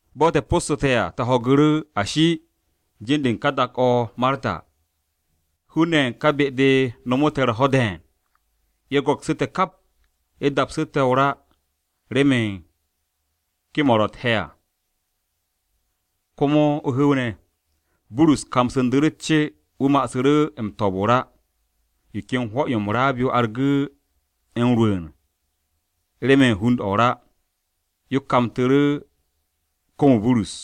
Bo̱ te̱ po̱ssu̱te̱ à te̱ ho̱gu̱ru̱, ashi, jin-de u̱n ka dak-o̱ o-Marta. Hun-ne̱ ye̱ u̱n ka be-de nomo te̱ u̱r-ho̱ de̱e̱n. Ye̱ go̱ksu̱ te̱ kap, ye̱ dapsu̱ te̱ o-ra remen kem-o̱ ro u̱t-he̱ à, komo o-hu̱w ne̱. Burus kamsu̱ndu̱ru̱ u̱t-ce wu̱ ma'asu̱ m-to̱o̱b o-ra. Yo ken hwo̱-yo m-raab yo argu̱ m-rwu̱u̱n remen hund-o̱ o-ra, yo kamtu̱ru̱ kom-o Burus.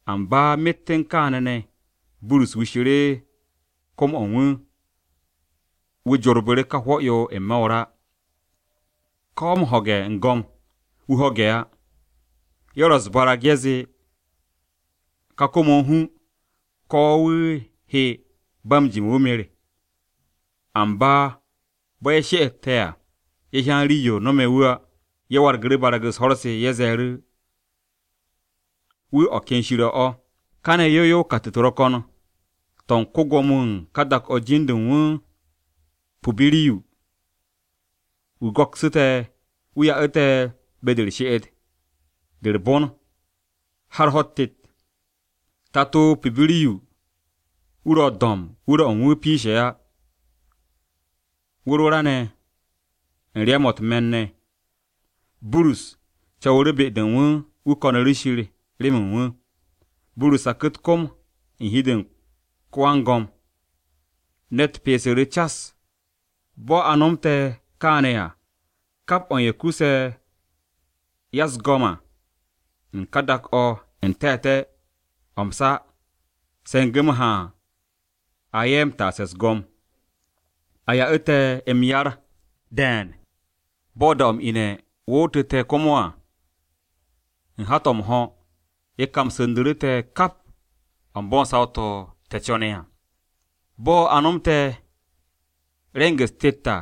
Amba myet u̱n kaane̱ ne̱, Burus wishu̱ru̱ kom-o̱ u̱n wu̱, wu̱ jorbu̱ru̱ ka hwo̱-yo n-me̱ o-ra, ko̱ m-hoog, wu̱ ho̱ge̱ á. Ye̱ ro̱ u̱s-barag ye̱ zee ka kom-o̱ a hu ko̱ wu̱a hye ba m-jime̱ wu̱ mer. Amba bo̱ ye̱ she'ete̱ à, ye̱ hyan rii-yo nome̱ wu̱ á. Ye̱ wargu̱ru̱ barag-u̱s ho̱r-se, ye̱ ze̱e̱ru̱ u̱nze wu̱ o̱ ken shir-o̱ o̱. Kane̱ yow yow kat-u̱t ro̱ ko̱n, to̱ u̱n ko-Gwo̱mo-wu̱ u̱n ka dak-o̱ jin-de u̱n wu̱ Pubiriyu. Wu̱ go̱ksu̱ te̱, wu̱ ya'u̱ te̱ be-de u̱r-she'et de u̱r-bon, har ho̱-u̱t tet. Tato-o Pubiriyu wu̱ ro̱ do̱mb wu̱r-o̱ u̱n wu̱ piishe̱ á, o-wu̱r o-ra u̱n ryam-o̱ u̱t-me̱n ne̱. Burus co̱wu̱ru̱ be-de u̱n wu̱, wu̱ ko̱nu̱ru̱ Shir remen wu̱. Burus saku̱ u̱t-kom u̱n hi-de u̱n ko-wan-go̱m, ne̱t pyeesu̱ru̱ cas. Bo̱ a nomte̱ kaane̱ à, kap o̱ u̱n ye̱ kuse̱ ya-u̱s-go̱m à u̱n ka dak-o̱ n-te̱te̱ o̱ m-sa se̱ngu̱ m-haan a ye̱ m-taase̱ u̱s-go̱m. Ye̱ ya'u̱ te̱ m-yar de̱e̱n. Bo̱ da-o̱ m-ine̱ wootu̱ te̱ komo à u̱n hat-o̱ m-ho̱, ye̱ kamsu̱ndu̱ru̱ te̱ kap o̱ u̱n bo̱ u̱n saw-to̱ te̱ co̱ne̱ à. Bo̱ a nomte̱ re̱ng-u̱s tet à,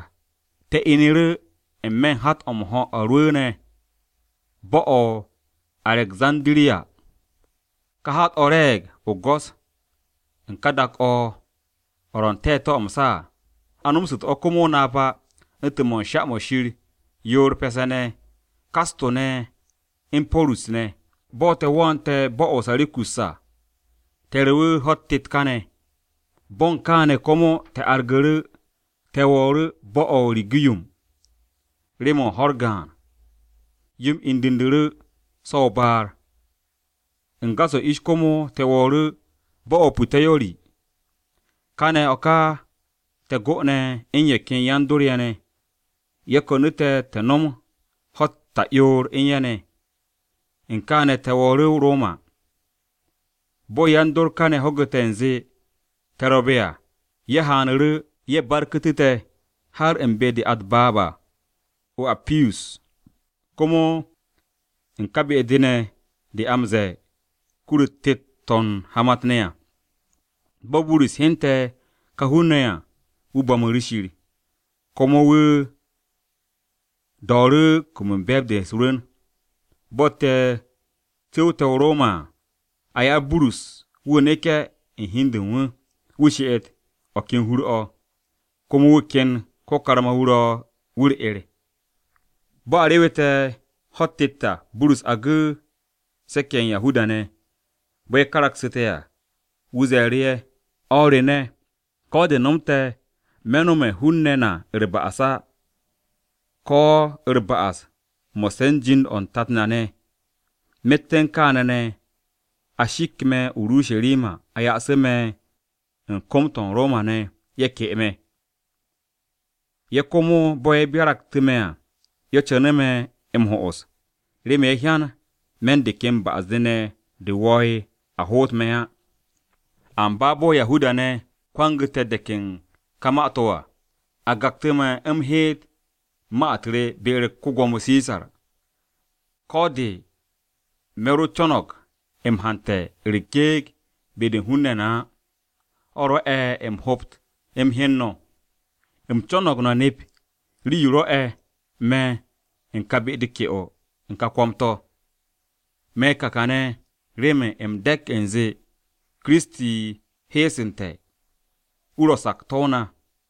te̱ inu̱ru̱ n-me̱ u̱n hat-o̱ rwu̱u̱ne̱ bo̱-o̱ o-Arekzandiriya. Ka hat-o̱ re̱e̱g o-go̱s u̱n ka dak-o̱ o̱ ro̱ n-te̱te̱ o̱ m-sa à. A nomsu̱tu̱ o̱ komo o-napa u̱ntu̱n sha-mo̱ u̱n shir yoor pe̱se̱-ne̱ Kasto u̱n Porus ne̱. Bo̱ te̱ wo̱o̱nte̱ bo̱-o̱ o-Sirakus à, te̱ rewu̱ ho̱-u̱t tet kane̱. Bo̱ u̱n kane̱ komo te̱ argu̱ru̱ te̱ wo̱o̱ru̱ bo̱-o̱ o-Rigiyum. Rew-mo̱ u̱n ho̱-u̱r gaan, yo-m indu̱ndu̱ru̱ so̱ o-baar, u̱n gas-o̱ ish komo te̱ wo̱o̱ru̱ bo̱-o̱ o-Puteyori. Kane̱ o̱ ka te̱ go'one̱ u̱n ye̱ ken yan-dor-ye̱ ne̱. Ye̱ ko̱nu̱ te̱ te̱ nom ho̱-u̱t ta'yoor u̱n ye̱ ne̱. U̱n kaane̱ te̱ wo̱o̱ru̱ o-Roma. Bo̱ yan-dor kane̱ ho̱gu̱te̱ u̱nze te̱ ro̱be̱ à, ye̱ haanu̱ru̱, ye̱ barku̱tu̱ te̱ har u̱n be-de a u̱t-baab à o-Appiyus, komo u̱n ka be-de ne̱ de a m-ze̱e̱ Kur-u̱t Tet-to̱ u̱n Hamat-ne̱ à. Bo̱ Burus hyente̱ ka hun-ne̱ ye̱ à, wu̱ bo̱mu̱ru̱ Shir. Komo wu̱ do̱o̱ru̱ kum u̱n be̱e̱b-de u̱s-rwu̱n. Bo̱ te̱ cu̱wte̱ o-Roma à, a ya'u̱ Burus wu̱ neke̱ u̱n hi u̱n de u̱n wu, wu̱ she'et u̱n o̱ ken hur-o̱, komo wu̱ ken ko-karma-wu̱ ro̱ wu̱ u̱r-'er. Bo̱ a rewete̱ ho̱-u̱t tet à, Burus agu̱ se̱k-ye̱ ye̱ u̱n Yahuda-ne̱. Bo̱ ye̱ karaksu̱te̱ à, wu̱ ze̱e̱ru̱ ye̱, “No̱ o̱r re ne̱, ko̱ de̱ nomte̱ me̱ no̱me̱ hun-ne̱ na u̱r-ba'as á, ko̱ u̱r-ba'as mo̱sse̱ u̱n jind-o̱ u̱n tat na ne̱. Myet u̱n kaane̱ ne̱ a shik me̱ o-Urusharima a ya'asu̱ me̱ u̱n kom-to̱ u̱n Roma-ne̱ ye̱ ke'e me̱. Ye̱ komo bo̱ ye̱ byaraktu̱ me̱ à, ye̱ co̱no̱g me̱ m-ho'os, remen ye̱ hyan me̱ u̱n de ken ba'as-de ne̱ de̱ wo̱o̱'e̱ a hoot me̱ á. Amba bo̱ Yahuda-ne̱ kwangu̱te̱ de̱k u̱n ka ma-to̱ à, a gaktu̱ me̱, u̱m heet ma-u̱t re be-u̱r ko-Gwo̱mo Sisar, ko̱ de̱ me̱ ro co̱no̱g m-hante̱ u̱s-gyekt be-de u̱n hun-ne̱ na á. O̱ rwo̱'e̱ u̱m hobt u̱m hyen no̱. U̱m co̱no̱g no̱ nep rii-yo rwo̱'e̱ me̱ u̱n ka be-de ke'o u̱n ka kwo̱m-to̱. Me̱ ka kane̱ remen u̱m de̱k u̱nze Kiristi heesu̱nte̱. Wu̱ ro̱ sakto̱-o na.”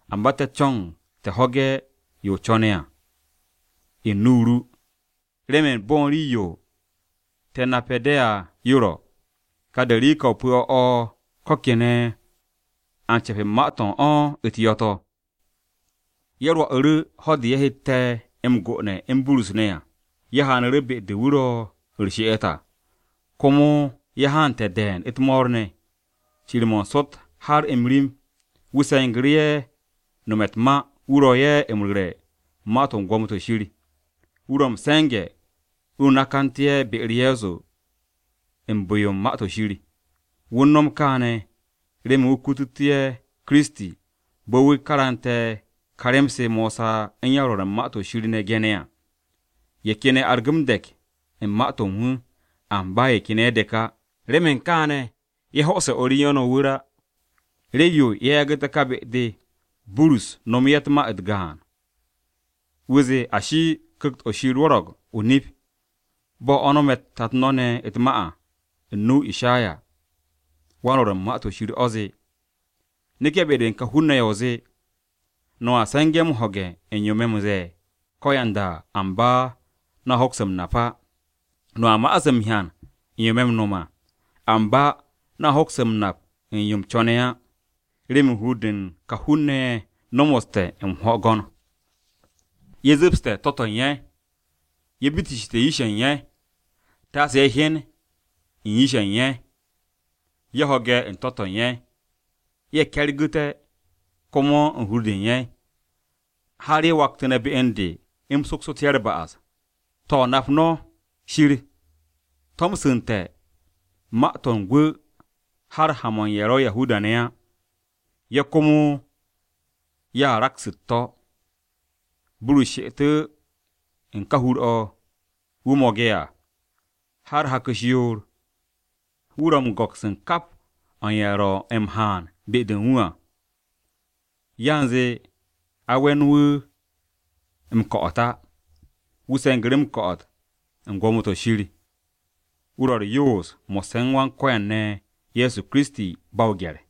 Amba te̱ co̱ng te̱ ho̱ge̱ yo o co̱ne̱ à u̱n nu-o ru, remen bo̱ u̱n rii-yo te̱ nape̱ de̱ à yo ro̱, ka derika-o pu̱-o̱ o̱ ko̱ kene̱ a m-ce̱p u̱n ma-to̱ u̱n o̱ u̱t-yo̱ to̱.” Ye̱ rwo̱'u̱ru̱ ho̱-de ye̱ hette̱ m-gone̱ u̱n Burus ne̱ à. Ye̱ haanu̱ru̱ be-de wu̱ ro̱ u̱r-she'et à, komo ye̱ haante̱ de̱e̱n u̱t-mo̱o̱r ne̱. Cir-mo̱ n-sot har m-rim, wu̱ se̱ngu̱ru̱ ye̱ nome̱ u̱t-ma wu̱ ro̱ ye̱ m-ru̱re̱ ma-to̱ u̱n Gwo̱mo-to̱ Shir. Wu̱ ro̱ m-se̱nge̱, wu̱ nakantu̱ ye̱ be-u̱r Ye̱so u̱n bu̱-yo u̱n Ma-to̱ Shir. Wu̱ u̱n no̱m kaane̱, remen wu̱ kututú ye̱ Kiristi bo̱ wu̱ karante̱ ka rem-se Mosa u̱n yan-Rwo̱r u̱n Ma-to̱ Shir ne̱ gene̱ à. Ye̱ ken ye̱ argu̱ de̱k u̱n ma-to̱ u̱n wu̱, amba ye̱ ken ye̱ dek á. Remen kaane̱, ye̱ ho'ose̱ o̱r u̱n ye̱ ne̱ o-wu̱r á. Rii-yo ye̱ yagu̱te̱ ka be-de Burus nomo ye̱ ma-u̱t gaan, wu̱ zee, “Ashi, Ku̱kt-o̱ Shir rwo̱ro̱g o-nip, bo̱ o̱ nome̱ tat no̱ ne̱ u̱t-ma à u̱n nu-o Ishayawan-Rwo̱r u̱n Ma-to̱ Shir o̱ zee, “ ‘Neke̱ be-de u̱n ka hun-ne̱ ye̱, o zee, “No̱a se̱nge̱ m-ho̱ge̱ u̱n yo me̱ m-ze̱e̱ ko̱yanda à, amba no̱ hoks m-nap á. No̱a ma'as m-hyan u̱n yo me̱ m-no̱m à, amba no̱ hoks m-nap u̱n yo u̱m co̱ne̱ á.” Remen hur-de u̱n ka hun-ne̱ ye̱ nomoste̱ m-hwo̱go̱n, ye̱ zu̱pste̱ to̱-to̱ u̱n ye̱, ye̱ bitisshe̱ yish-ye̱ u̱n ye̱, Taase ye̱ hyen u̱n yish-ye̱ u̱n ye̱, ye̱ ho̱ge̱ u̱n to̱-to̱ u̱n ye̱, ye̱ ke̱rgu̱te̱ komo u̱n hur-de u̱n ye̱, har ye̱ waktu̱nte̱ be u̱n de u̱m soksu̱tu̱ ye̱ u̱r-ba'as.’ “To̱, nap no̱, Shir tomsu̱nte̱ ma-to̱ u̱n gwu̱ har ha-mo̱ u̱n ye̱ ro̱ Yahuda-ne̱ á. Ye̱ komo ye̱ a raks u̱t-to̱!” Burus she'etu̱ u̱n ka hur-o̱ wu̱ mo̱ge̱ à har hak-u̱s yoor, wu̱ ro̱ u̱n go̱ks u̱n kap o̱ u̱n ye̱ ro̱ m-haan be-de u̱n wu̱ à. Yanze a we̱n wu̱ m-ko̱'o̱t á, wu̱ se̱ngu̱ru̱ ko̱'o̱t u̱n Gwo̱mo-to̱ Shir. Wu̱ ro̱ u̱r-yoos mo̱sse̱ u̱n Wan-Ko̱yan ne̱ Ye̱so Kiristi ba o-gye̱r.